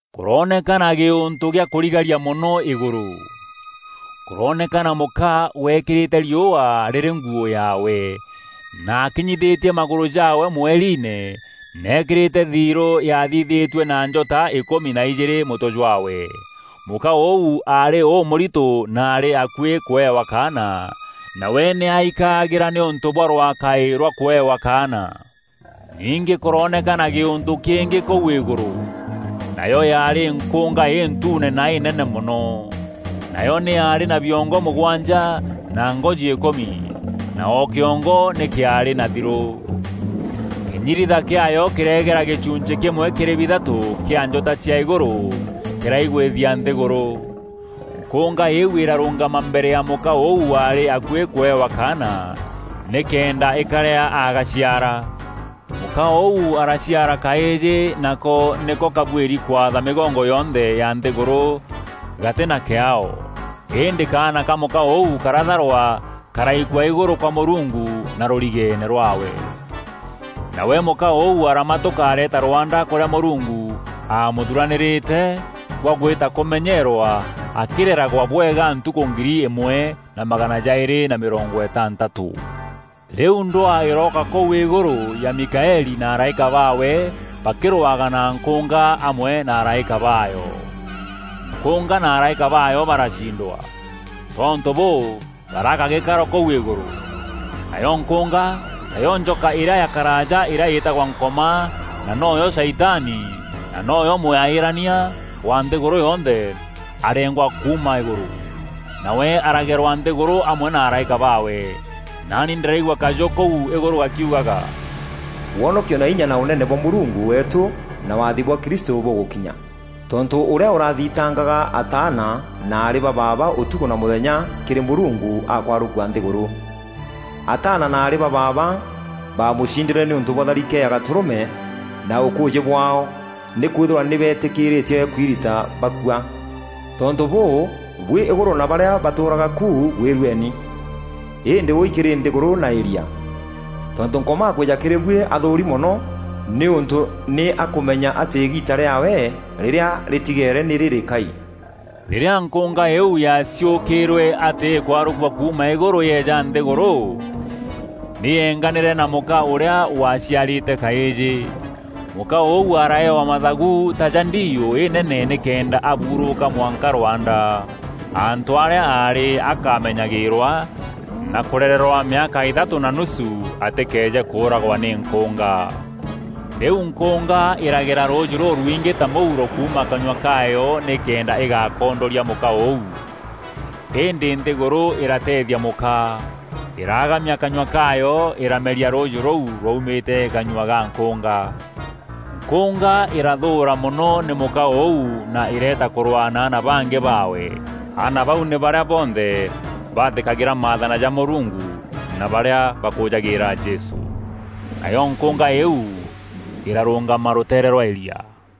Kûroonekana gîûntû gîa kûrigaria mono îgûrû. Kûrooneka mûka weekîrîte riûa rîrî nguû yaawe, na akinyithîtie magûrû jaawe mweriine na eekîrîte thirû yaathithîtue na njota îkûmi na ijîîrî mûtwe jwaawe. Mûka ûu aarî ûmûrito na aarî akuî kûewa kaana, nawe nî aikaagîra nîûntû bwa rwakaî rwa kûewa kaana. Ningî kûroonekana gîûntû kîngî kûu îgûrû. Nayo yaarî nkûnga întuune na înene mono. Nayo nî yaarî na biongo mûgwanja na ngoji îkûmi, na o kîongo nî kîaarî na thirû. Kînyiritha kîaayo kîreegera gîchunchî kîmwe kîrî bithatû kîa njota cia îgûrû kîraigwîthia nthîgûrû. Nkûnga îîu îrarûngama mbere ya mûka ûu waarî akuî kûewa kaana, nîkenda îkarîa agaciara. Mûka ûu araciara kaîjî nako nîko kabuîri kwatha mîgongo yonthe ya nthîgûrû gatî na kîaao. Îndî kaana ka mûka ûu karatharwa karaikua îgûrû kwa Mûrungu na rûrigeene rwaawe. Nawe mûka ûu aramatûka areeta rwanda kûrîa Mûrungu aamûthuranîrîte, gwa gwîta kûmenyeerwa akîreragwa bwega ntukû ngiri îmwe na magana jaîrî na mîrongo îtantatû. Rîu ndwaa îrooka kûu îgûrû ya Mikaeli na araîka baawe bakîrwaga na nkûnga amwe na araîka baayo. Nkûnga na araîka baayo baracindwa. Tontû bûû, baraaga gîkaro kûu îgûrû. Nayo nkûnga, tayo njoka îrîa ya karaaja îrîa îtagwa Nkoma na noyo Shaitani, na noyo mwaîîrania wa nthîgûrû yonthe, areengwa kuuma îgûrû. Nawe aragerwa nthîgûrû amwe na araîka baawe. Naani ndîraigua kajû kûu îgûrû gakiugaga, “Wonokio na inya na ûnene bwa Mûrungu weetû na waathi bwa Kristû bûgûkinya. Tontû ûrîa ûrathitangaga ataana na aarî ba baaba ûtukû na mûthenya kîrî Mûrungu akwarûkua nthîgûrû. Ataana na aarî ba baaba baamûcindîre nîûntû bwa tharike ya Gatûrûme na ûkûûjî bwaao nîkwîthîrwa nî beetîkîîrîtie kwirita bakua. Tontû bûû, buî îgûrû na barîa batûûraga ku gwîrueni. Îndî wûûi kîrî nthîgûrû na îria! Tontû Nkoma akwîîja kîrî buî athûûri mono nîûntû nî akûmenya atî îgiita rîaawe rîrîa rîtigeere nî rîrîkai.” Rîrîa Nkûnga îîu yaaciûkîîrwe atî îkwarûkua kuuma îgûrû yeeja nthîgûrû, nî yeenganîre na mûka ûrîa waciarîte kaîjî. Mûka ûu araaewa mathagu ta ja ndiiû înene nîkenda aburûûka mwanka rwanda, antû arîa aarî akamenyagîîrwa na kûrererwa mîaka îthatû na nusu, atîkeeje kûûragwa nî nkûnga. Rîu nkûnga îragera rûûjî rûrwingî ta mûuro kuuma kanyua kaayo nîkenda îgakondoria mûka ûu. Îndî nthîgûrû îrateethia mûka. Îraagamia kanyua kaayo îrameria rûûjî rûu rwaumîre kanyua ga nkûnga. Nkûnga îrathûûra mono nî mûka ûu na îreeta kûrwaa na aana bangî baawe. Aana bau nî barîa bonthe bathîkagîra maathana ja Mûrungu na barîa bakûûjagîîra Jesû. Nayo nkûnga îîu îrarûngama rûteere rwa îria.